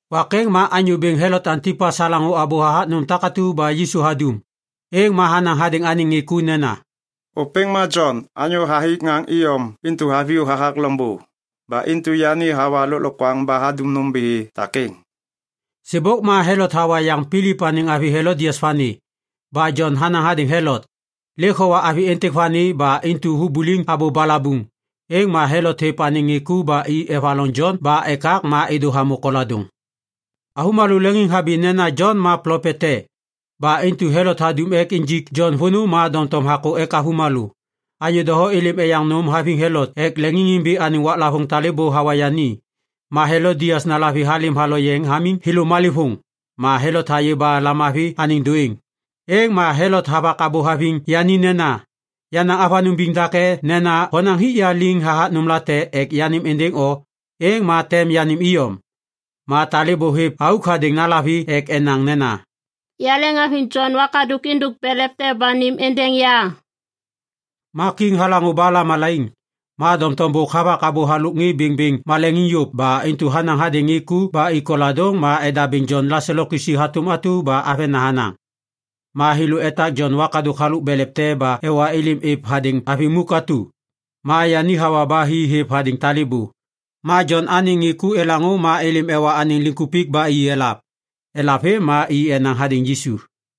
Wak êŋ ma Anyô Bêŋ Helot Antipas halaŋô abô hathak nôm takatu ba Yisu hadum. Êŋ ma hanaŋ hadêŋ anêŋ ŋê ku nena, “Ôpêŋ ma Jon anyô hathik ŋaŋ iyom intu haviyô hathak loŋbô. Ba intu yani hawa lôklokwaŋ ba hadum nômbithi takêŋ.” Sêbôk ma Helot hawa yaŋ Pilip anêŋ avi Helodias vani. Ba Jon hanaŋ hadêŋ Helot, “Lêk howa avi êntêk vani ba intu hubuliŋ abô balabuŋ.” Êŋ ma Helot hêv anêŋ ŋê ku ba i evaloŋ Jon ba ekak ma êdô hamô koladôŋ. Avômalô leŋiŋhabi nena Jon ma plopet te. Ba intu Helot hadum ek injik Jon vônô ma doŋtom hakô ek avômalô. Anyô doho êlêm eyaŋ nôm haviŋ Helot ek leŋiŋhabi anêŋ waklavôŋ talêbô hawa yani. Ma Helodias nalavi halêm haloyeŋ hamiŋ thêlô malêvôŋ. Ma Helot hayê ba lamavi anêŋ dôêŋ. Êŋ ma Helot havak abô haviŋ yani nena, “Yanaŋ avanôŋ biŋ dake nena honaŋ hik ya liŋ hathak nômlate ek yanêm êndêŋ o, êŋ ma tem yanêm iyom.” Ma talêbô hêv auk hadêŋ nalavi ek enaŋ nena, “Yaleŋhaviŋ Jon wakadôk êndôk belev te ba nêm êndêŋ ya!” Ma kiŋ halaŋô ba lamalaiŋ. Ma doŋtom bôk havak abô halôk ŋê bêŋbêŋ maleŋiŋ yôv ba intu hanaŋ hadêŋ ŋê ku ba i koladôŋ ma edabêŋ Jon laselo kisi hatôm atu ba avena hanaŋ. Ma thêlô etak Jon wakadôk halôk belev te ba ewa êlêm êv hadêŋ avi muk atu. Ma yani hawa ba hi hêv hadêŋ talêbô. Ma Jon anêŋ ŋê ku elaŋô ma êlêm ewa anêŋ liŋkupik ba i elav. Elav vêm ma i enaŋ hadêŋ Yisu.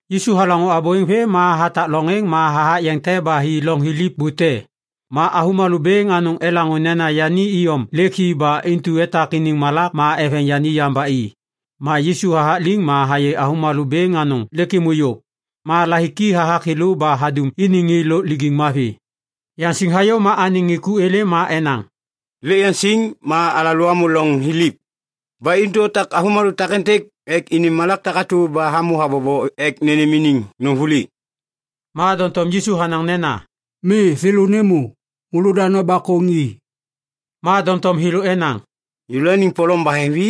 Yisu halaŋô abô êŋ vêm ma hatak loŋ êŋ ma hathak yeŋ te ba hi loŋ thiliv bute. Ma avômalô bêŋ anôŋ elaŋô nena yani iyom lêk hi ba intu etak iniŋ malak ma eveŋ yani yam ba i. Ma Yisu hathak liŋ ma hayê avômalô bêŋ anôŋ lêk êmô yôv. Ma lahiki hathak thêlô ba hadum iniŋ ŋê lôk lijiŋ mavi. Yaŋsiŋ hayô ma anêŋ ŋê ku êlêm ma enaŋ, “Lêk yaŋsiŋ ma alalô amô loŋ thiliv. Ba intu otak avômalô takêntêk ek ini malak takatu ba hamô habobo ek nênêm iniŋ nôm vuli.” Ma doŋtom Yisu hanaŋ nena, “Mi! Thêlô nêmô. Môlô da nobakôŋ i.” Ma doŋtom thêlô enaŋ, “Yêlôaniŋ polom baheŋvi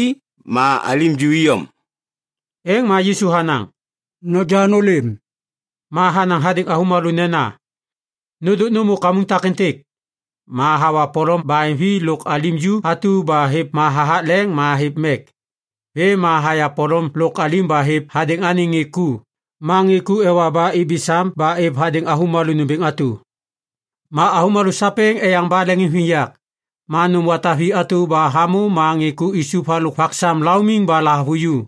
ma alim ju iyom.” Êŋ ma Yisu hanaŋ, “Noja nôlêm.” Ma hanaŋ hadêŋ avômalô nena, “Nôndôk nômô kamuŋ takêntêk.” Ma hawa polom baheŋvi lôk alim ju atu ma hêv ma hathak leŋ ma hêv mek. Vêm ma haya polom lôk alim ba hêv hadêŋ anêŋ ŋê ku, ma ŋê ku ewa ba ibi sam ba êv hadêŋ avômalô nômbêŋ atu. Ma avômalô sapêŋ eyaŋ ba leŋiŋviyak. Ma nôm wata vi atu ba hamô ma ŋê ku isup halôk vak sam laumiŋ ba lahavuju.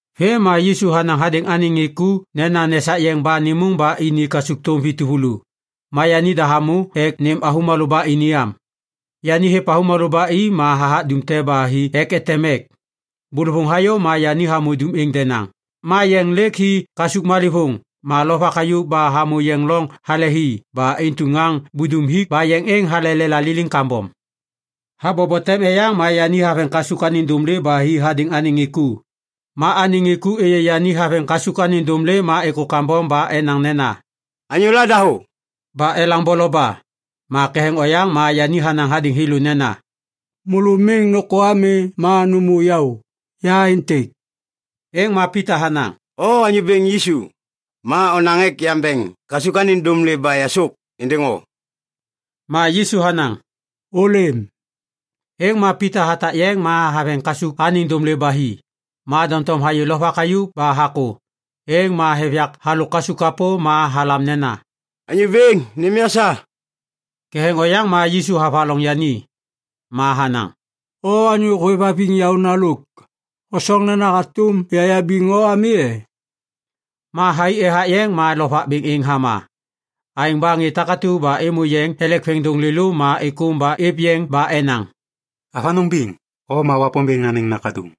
Vêm ma Yisu hanaŋ hadêŋ anêŋ ŋê ku nena nesak yeŋ ba nêmôŋ ba ini kasukthôm vi tuvulu. Ma yanida hamô ek nêm avômalô ba ini am. Yani hêv avômalô ba i ma hathak dum te ba hi ek eteŋ mek. Bôlôvôŋ hayô ma yani hamô dum êŋ denaŋ. Ma yeŋ lêk hi kasuk malêvôŋ ma lovak hayuv ba hamô yeŋ loŋ hale hi ba intu ŋaŋ budum hik ba yeŋ êŋ halelela liliŋ kambom. Habobo tem eyaŋ ma yani haveŋ kasuk anêŋ dômlê ba hi hadêŋ anêŋ ŋê ku. Ma anêŋ ŋê ku êyê yani haveŋ kasuk anêŋ dômlê ma êkô kambom ba enaŋ nena, “Anyôla dahô!” ba elaŋ boloba. Ma ketheŋ oyaŋ ma yani hanaŋ hadêŋ thêlô nena, “Môlô miŋ nôkô ami ma nômô yaô! Ya êntêk!” Êŋ ma Pita hanaŋ, “O Anyô Bêŋ Yisu, ma onaŋ ek yambeŋ kasuk anêŋ dômlê ba yasôk êndêŋ o.” Ma Yisu hanaŋ, “Ôlêm.” Êŋ ma Pita hatak yeŋ ma haveŋ kasuk anêŋ dômlê ba hi. Ma doŋtom hayê lovak hayuv ba hakô. Êŋ ma hêv yak halôk kasuk kapô ma halam nena, “Anyô Bêŋ! Nêm ya sa!” Ketheŋ oyaŋ ma Yisu havaloŋ yani. Ma hanaŋ, “O anyô hôêvhaviŋ yaôna lôk. Hosoŋ nena hatôm yayabiŋ o ami e?” Ma thai ethak yeŋ ma lovak bêŋ êŋ hama. Aêŋ ba ŋê takatu ba êmô yeŋ elek veŋiŋdôŋ lêlô ma êkôm ba êv yeŋ ba enaŋ, “Avanôŋ biŋ! O ma Wapômbêŋ anêŋ Nakaduŋ.”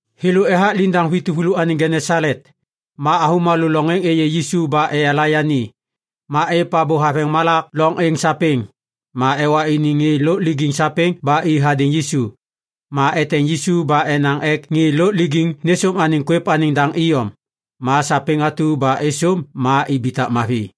Thêlô ethak liŋdaŋ vi tuvulu anêŋ Genesalet. Ma avômalô loŋ êŋ êyê Yisu ba eyala yani. Ma êv abô haveŋ malak loŋ êŋ sapêŋ. Ma ewa iniŋ ŋê lôk lijiŋ sapêŋ ba i hadêŋ Yisu. Ma eteŋ Yisu ba enaŋ ek ŋê lôk lijiŋ nêsôm anêŋ kwêv anêŋ daŋ iyom. Ma sapêŋ atu ba êsôm ma ibitak mavi.